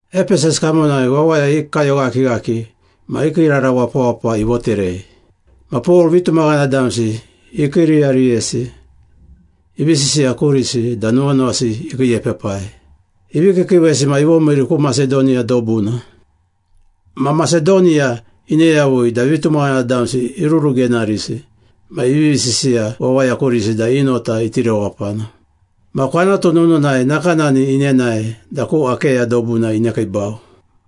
Epesas kamonai wawaya i kayoghakighaki ma i kiirara wapawapa ivoterei. Ma Pol vitumaghana damsi ikiiriyariyesi, ivi sisiya kurisi da nuwanuwasi ikiiepepai. Ivi kiikiiwesi ma ivomiiri ku Masedoniya dobuna. Ma Masedoniya ine yavui da vitumaghana damsi irurugenarisi ma ivivi sisiya wawaya kurisi da i nota iti rewapana. Ma kwanatu nununai nakanani inenae da ku Akeya dobuna inekiibau,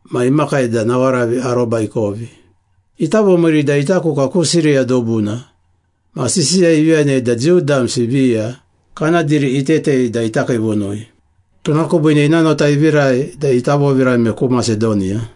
ma imakai da nawaravi aroba ikovi. Ita vomiiri da ita kuka ku Siriya dobuna ma sisiya ivi yanei da Jiu damsi viya kana diri itetei da ita kiivunui. Tuna kubiine ina nota ivirai da ita vovirame ku Masedoniya.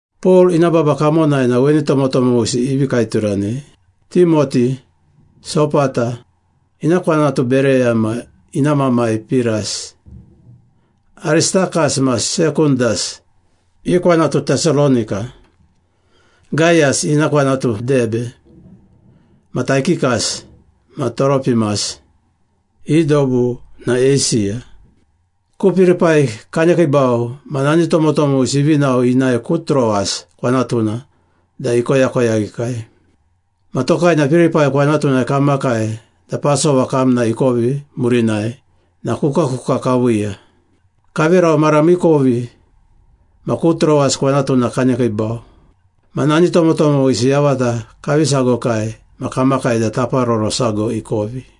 Pol ina baba kamonai na weni tomotomowisi ivi kaeturanei. Timoti, Sopata (ina kwanatu Bereya ma ina mamai Piras), Aristakas ma Sekundas (i kwanatu Tesalonika), Gayas (ina kwanatu Debe), ma Taikikas ma Toropimas (i dobu na Eisiya). Ku Pilipai kanekiibau ma nani tomotomowisi ivi nao inae ku Troas kwanatuna da ikoyakoyaghikai. Ma tokai na Pilipai kwanatunai kamakai da Pasova kamna ikovi murinai na kukakuka kaviiya. Kaverau mara miikovi ma ku Troas kwanatuna kanekiibau. Ma nani tomotomowisi yavata kavi sagokai ma kamakai da taparoro sago ikovi.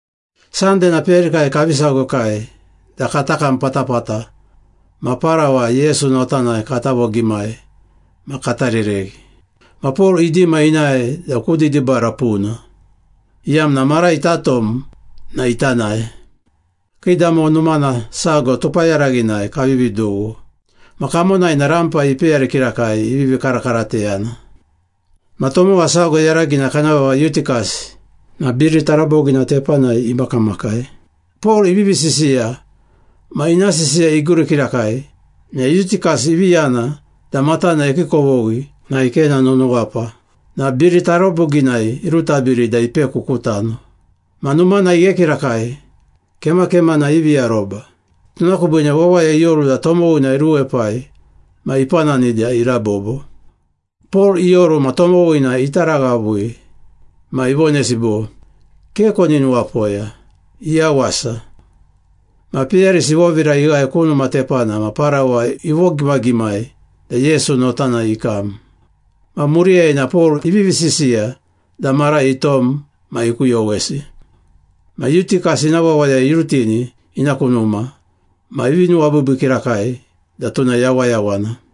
Sande na peyarikai kavi sagokai da kata kam patapata ma parawa Yesu notanai kata vogimai ma kata rereghi. Ma Pol idima inae da ku didibara puna, iyamna mara ita tom na ita nae. Kiidamo numana sago tupayaraghinai kavivi dughu. Ma kamonai na rampa ipeyari kirakai ivivi karakarateyana. Ma tomowa sago yaragina kana vava Yutikas na biri tarabogina tepanai imakamakai. Pol ivivi sisiya ma ina sisiya iguri kirakai na Yutikas ivi yana da matana ikiikovoghi na ikena nunuwapa na biri taraboginai irutabiri da ipeku ku tano. Ma numana ighe kirakai, kemakemana ivi aroba. Tuna kubiine wawaya ioru da tomowina iruepai ma ipanani da irabobo. Pol ioru ma tomowina itaraghavui ma ivonesi bo, “Ke koni nuwapoya. Iyawasa.” Ma peyarisi ivovira ighae ku numa tepana ma parawa ivogimagimai da Yesu notanai ikam. Ma muriyai na Pol ivivi sisiya da mara itom ma ikuyowesi. Ma Yutikas ina wawaya irutini ina ku numa ma ivi nuwabiibii kirakai da tuna yawayawana.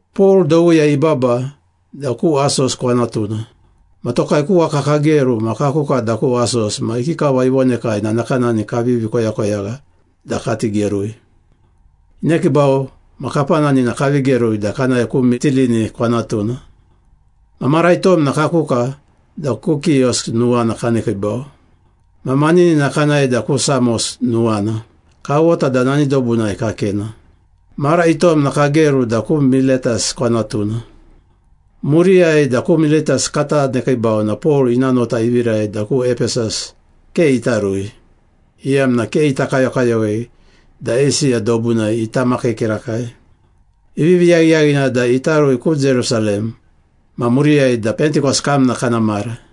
Pol dowiyai ibaba da ku Asos kwanatuna. Ma tokai ku waka kageru ma kakuka da ku Asos ma ikikava ivonekai na nakanani kavivi koyakoyagha da kati gerui. Inekiibau ma kapanani na kavi gerui da kanae ku Mitilini kwanatuna. Ma mara itom na kakuka da ku Kios nuwana kanekiibau. Ma maninina kanae da ku Samos nuwana, kawota da nani dobunai kakena. Mara itom na kageru da ku Miletas kwanatuna. Muriyai da ku Miletas kata nekiibau na Pol ina nota ivirai da ku Epesas ke ita rui, iyamna ke ita kayokayowei da Eisiya dobunai ita makii kirakai. Ivivi yaghiyaghina da ita rui ku Jerusalem ma muriyai da Pentikos kamna kana mara.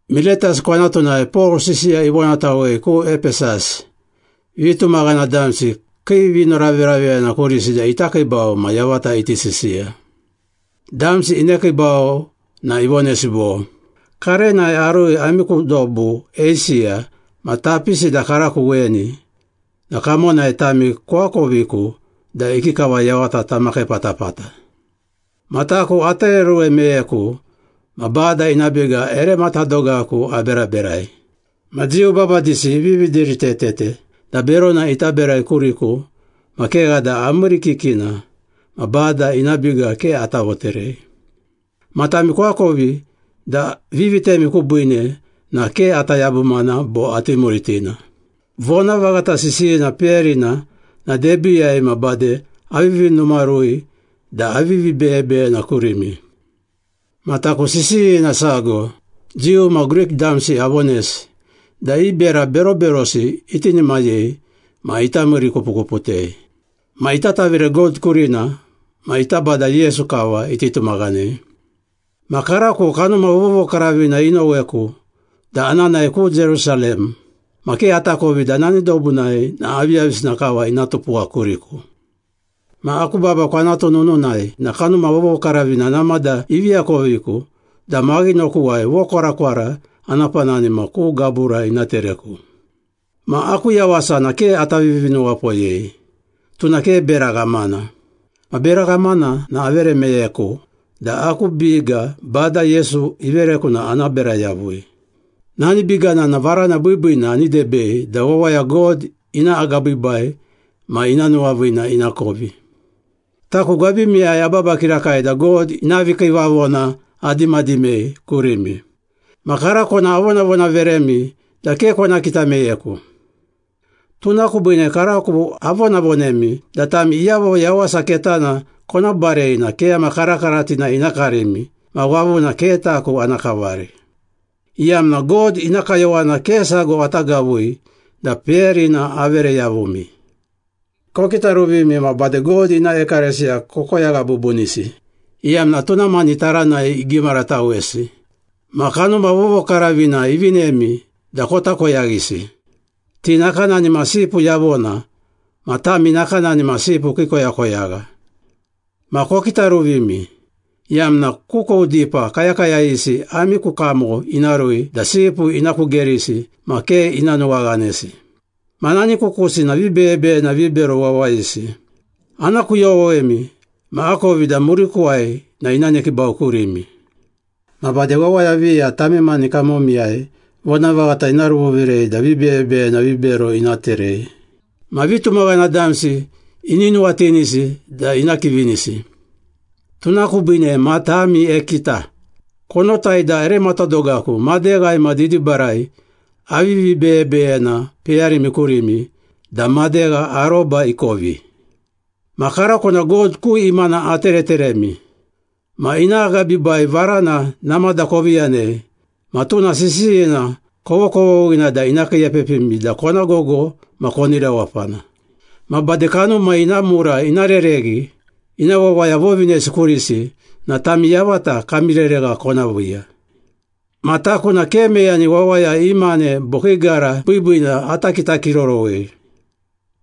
Miletas kwanatunai Pol sisiya ivonatawei ku Epesas, vitumaghana damsi kii vinoraveraveyana kurisi da ita kiibau ma yavata iti sisiya. Damsi inekiibau na ivonesi bo, “Karenai arui ami ku dobu Eisiya ma tapisi da karako weni, na kamonai tami koakoviku da ikikava yavata tamakii patapata. Ma taku atereoruwe meyeku ma Bada ina biga ere matadogaku aberaberai. Ma Jiu babadisi ivivi diritetete da berona ita berai kuriku ma kegha da amiirikikina ma Bada ina biga ke ata voterei. Ma tami koakovi da vivitemi kubiine na ke ata yabumana bo ati muritina. Vonavaghata sisiyina peyarina na debiiyai ma bade avivi numarui da avivi beyebeyena kurimi. Ma taku sisiyina sago Jiu ma Grik damsi avonesi da i bera beroberosi itinimayei ma ita miirikupukuputei. Ma ita tavire God kurina ma ita Bada Yesu kava iti tumaghanei. Ma karako Kanuma Vovokaravina inoweku da ana nae ku Jerusalem ma ke atakovi da nani dobunai na aviyavisina kava ina tupuwa kuriku. Ma aku baba kwanatu nununai na Kanuma Vovokaravina namada ivi akoviku da maghinokuwai vokwarakwara ana panani ma ku gabura ina tereku. Ma aku yawasa na ke ata vivinuwapoyei, tuna ke bera ghamana. Ma bera ghamana na avere meyeku da aku biga Bada Yesu ivereku na ana bera yavui. Nani bigana na varana biibiina ani debei da wawaya God ina agabiibai ma ina nuwaviina inakovi.” “Taku gwabimiyai ababa kirakai da God ina vikiivavona adimadimei kurimi. Ma karako na avonavonaveremi da ke kona kita meyeku. Tuna kubiine karako avonavonemi da tami iyavo Yawasa Ketana kona barei na keyama karakaratina ina karimi ma wavuna ke taku ana kavari, iyamna God ina kayowana ke sago ata gavui da peyarina avere yavumi. Kokitaruvimi ma bade God ina ekalesiya kokoyagha bubunisi, iyamna tuna mani taranai igimaratawesi ma Kanuma Vovokaravina ivinemi da kota koyaghisi. Ti nakanani ma sipu yavona ma tami nakanani ma sipu kii koyakoyagha. Ma kokitaruvimi, iyamna kukou dipa kayakayayisi ami ku kamo ina rui da sipu ina kugerisi ma ke ina nuwaghanesi. Ma nani kukusi na vibeyebeyena vibero wawayisi. Ana kuyowemi ma akovi da murikuwai na ina nekiibau kurimi. Ma bade wawaya viya tami mani kamomiyai vonavaghata ina ruvovirei da vibeyebeyena vibero ina terei. Ma vitumaghana damsi ini nuwatinisi da ina kivinisi. Tuna kubiine matami ekita! Konotai da ere matadogaku, madeghai ma didibarai avivi beyebeyena peyarimi kurimi da madegha aroba ikovi.” “Ma karako na God ku imana atereteremi. Ma ina agabiibai varana namada kovi yanei ma tuna sisiyina kovokovoghina da ina kiiepepimi da kona gogo ma koni rewapana. Ma bade kanuma ina mura ina rereghi ina wawaya vovinesi kurisi na tami yavata kami reregha kona viiya. Ma taku na ke meyani wawaya i mane bo kii gara biibiina ata kitakirorowei.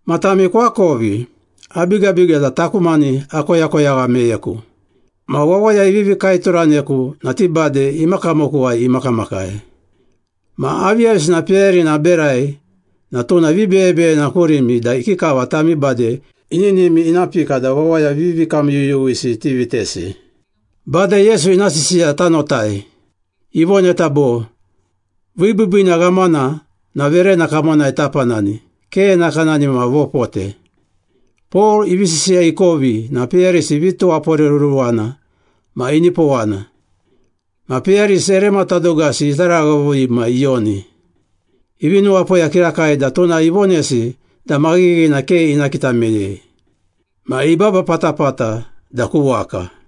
Ma tami koakovi, abigabiga da taku mani akoyakoyagha meyeku. Ma wawaya ivivi kaeturaneku na ti bade ima kamokuwai imakamakai. Ma aviyavisina peyarina aberai na tuna vibeyebeyena kurimi da ikikava tami bade ininimi ina pika da wawaya vivikamyuyuwisi tivitesi. Bada Yesu ina sisiya tanotai. Ivoneta bo, ‘Vibiibiina ghamana na verena kamonai tapanani, ke nakanani ma vopote.’” Pol ivi sisiya ikovi na peyarisi ivi tuwaporeruruwana ma inipowana. Ma peyarisi ere matadogasi itaraghavui ma iyoni. Ivi nuwapoya kirakai da tuna ivonesi da maghighina ke ina kita meyei. Ma ibaba patapata da ku waka.